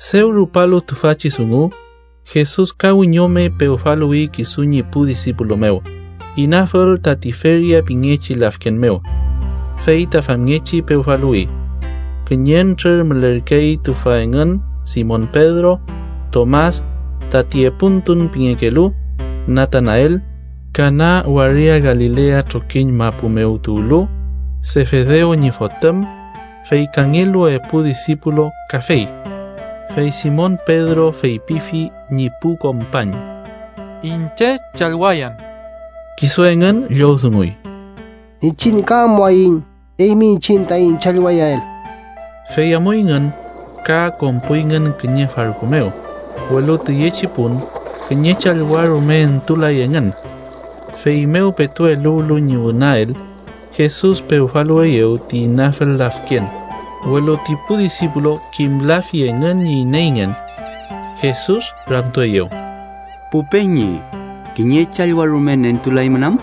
Dew rupalu tüfachi dungu, Jesus ka wiñome pewfaluwi kisu ñi pu disipulu mew, inafül ta Tiferias pingechi lafken mew. Fey ta famngechi pewfaluwi. Kiñentrür mülerkey tüfa engün Simon Pedro, Tomas, tati Epuntun pingekelu, Natanael, Kana waria Galilea trokiñ mapu mew tuwlu, Sefedew ñi fotüm, fey kangelu epu disipulu kafey. Fey Simon Pedro feypifi ñi pu kompañ: —Iñche challwayan. Kisu engün llowdunguy: —Iñchiñ ka amuaiñ eymi iñchiñ taiñ challwayael. Fey amuyngün, ka konpuyngün kiñe farku mew, welu tüyechi pun kiñe challwa rume entulay engün. Feymew petu eluwlu ñi wünael, Jesus pewfaluweyew ti inafül lafken, welu ti pu disipulu kimlafi engün ñi ineyngen. Jesus ramtueyew: —Pu peñi, ¿kiñe challwa rume nentulaymün am?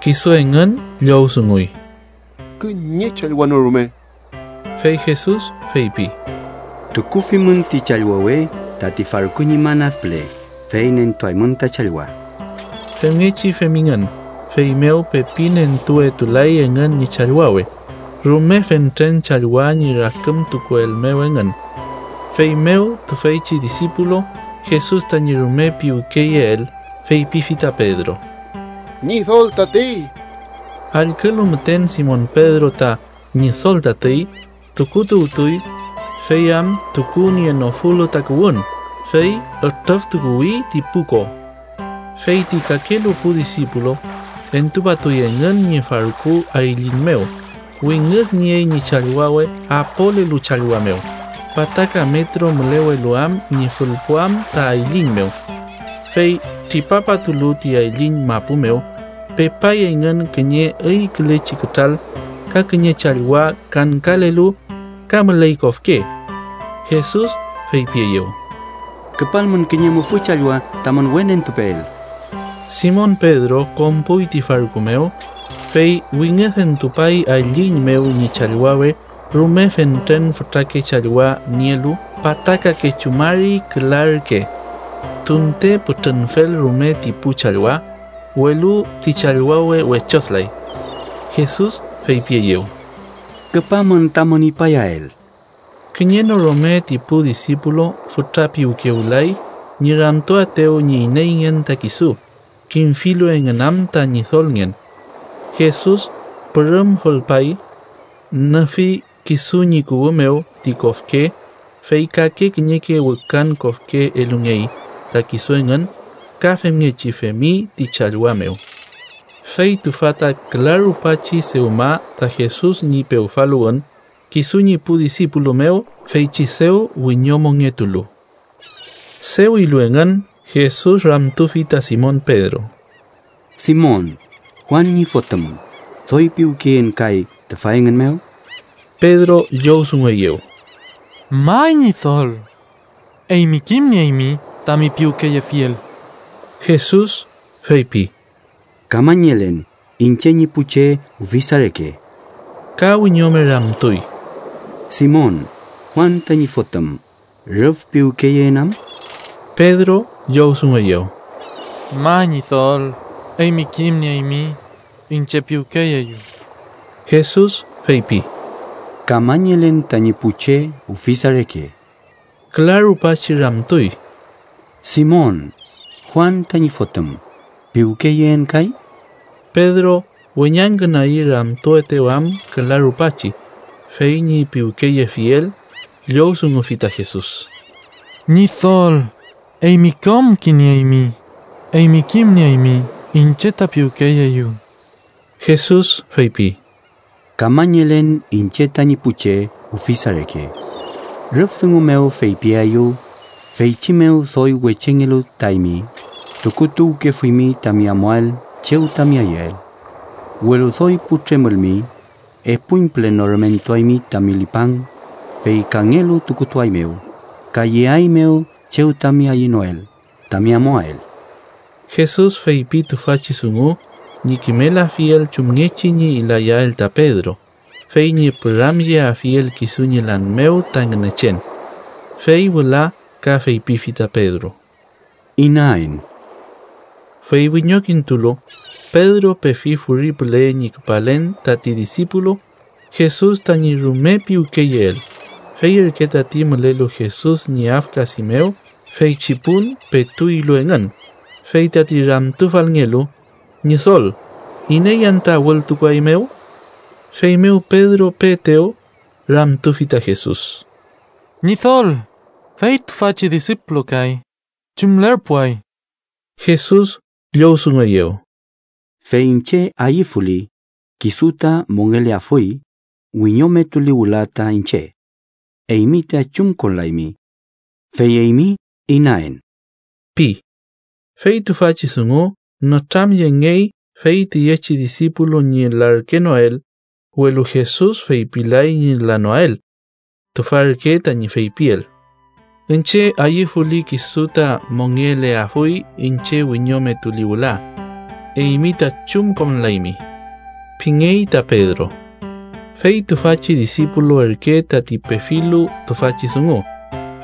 Kisu engün llowdunguy: —Kiñe challwa no rume. Fey Jesus feypi: —Tukufimün ti challwawe tati farku ñi man ad püle, fey nentuaymün ta challwa. Femngechi femingün, feymew pepi nentuwetulay engün ñi challwawe rume fentren challwa ñi rakümtukuel mew engün. Feymew tüfeychi disipulu Jesus tañi rume piwkeyeel, feypifi ta Pedro: —¡Ñidol tatey! Allkülu müten Simon Pedro ta “Ñidol tatey”, tukutuwtuy, fey am tukunienofulu takuwün, fey ütrüftukuwi ti pu ko. Fey ti kakelu pu disipulu entupatuy engün ñi farku ayliñ mew, wingüdniey ñi challwawe apolelu challwa mew pataka metro mülewelu am ñi fülpuam ta ayliñ mew. Fey tripapatulu ti ayliñ mapu mew, pepay engün kiñe üykülechi kütral ka kiñe challwa kangkalelu, ka müley kofke. Jesus feypieyew: —Küpalmün kiñe mufü challwa tamün we nentupeel. Simon Pedro konpuy ti farku mew, fey wingüdentupay ayliñ mew ñi challwawe rume fentren fütrake challwa nielu pataka kechu mari küla ürke. Tunte pütrünfel rume ti pu challwa, welu ti challwawe wechodülay. Jesus feypieyew: —Küpamün tamün ipayael. Kiñe no rume ti pu disipulu fütra piwkewlay ñi ramtuaetew ñi ineyngen ta kisu, kimfilu engün am ta Ñidolngen. Jesus pürüm fülpay, nüfi kisu ñi kuwü mew ti kofke, fey kake kiñeke wükan kofke elungey ta kisu engün ka femngechi femi ti challwa mew. Fey tüfa ta küla rupachi dewma ta Jesus ñi pewfaluwün kisu ñi pu disipulu mew feychi dew wiñomongetulu. Dew ilu engün, Jesus ramtufi ta Simon Pedro: —Simon, Juan ñi fotüm, ¿doy piwkeyeen kay tüfa engün mew? Pedro llowdungueyew: —May, Ñidol. Eymi kimnieymi tami piwkeyefiel. Jesus feypi: —Kamañelen iñche ñi pu che ufisa reke. Ka wiñome ramtuy: —Simon, Juan tañi fotüm, ¿rüf piwkeyeen am? Pedro llowdungueyew: —May, Ñidol. Eymi kimnieymi iñche piwkeyeeyu. Jesus feypi: —Kamañelen tañi pu che ufisa reke. Küla rupachi ramtuy: —Simon, Juan tañi fotüm, ¿piwkeyeen kay? Pedro, weñangkünagi ramtuetew am küla rupachi fey ñi piwkeyefiel, llowdungufi ta Jesus: —Ñidol, eymi kom kimnieymi. Eymi kimnieymi iñche ta piwkeyeeyu. Jesus feypi: —Kamañelen iñche tañi pu che ufisa reke. Rüf dungu mew feypiaeyu feychi mew doy wechengelu ta eymi tukutuwkefuymi tami amuael chew tami ayüel. Welu doy putremülmi, epuñpüle norümentuaymi tami lipang fey kangelu tukutuaeymew, ka yeaeymew chew tami ayünoel tami amuael. Jesus feypi tüfachi dungu ñi kimelafiel chumngechi ñi layael ta Pedro, fey ñi püramyeafiel kisu ñi lan mew ta Ngünechen. Fey wüla ka feypifi ta Pedro: —¡Inaen! Fey wiñokintulu, Pedro pefi furi püle ñi küpalen tati disipulu Jesus tañi rume piwkeyeel, fey ürke tati mülelu Jesus ñi afkadi mew feychi pun petu ilu engün, fey tati ramtufalngelu: “Ñidol, ¿iney anta wültukuaeymew?” Feymew Pedro peetew, ramtufi ta Jesus: —Ñidol, fey tüfachi disipulu kay ¿chumlerpuay? Jesus llowdungueyew: —Fey iñche ayüfuli, kisu ta mongeleafuy wiñometuli wüla ta iñche. Eymi ta chumkonlaymi. Fey eymi ta inaen ―pi. Fey tüfachi dungu nütramyengey fey tüyechi disipulu ñi larkenoael, welu Jesus feypilay ñi lanoael. Tüfa ürke tañi feypiel: “Iñche ayüfuli, kisu ta mongeleafuy iñche wiñometuli wüla. Eymi ta chumkonlaymi” pingey ta Pedro. Fey tüfachi disipulu ürke tati pefilu tüfachi dungu,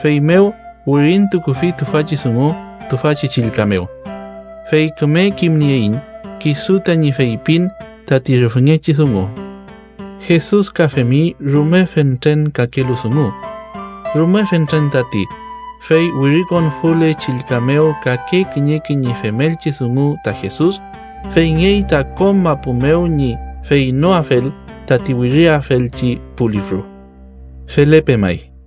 feymew wirintukufi tüfachi dungu tüfachi chillka mew. Fey küme kimnieiñ kisu tañi feypin tati rüfngechi dungu. Jesus ka femi rume fentren kakelu dungu. Rume fentren tati, fey wirikonfule chillka mew kake kiñeke ñi femelchi dungu ta Jesus, feyngey ta kom mapu mew ñi feynoafel tati wiriafelchi pu lifru. Felepe may.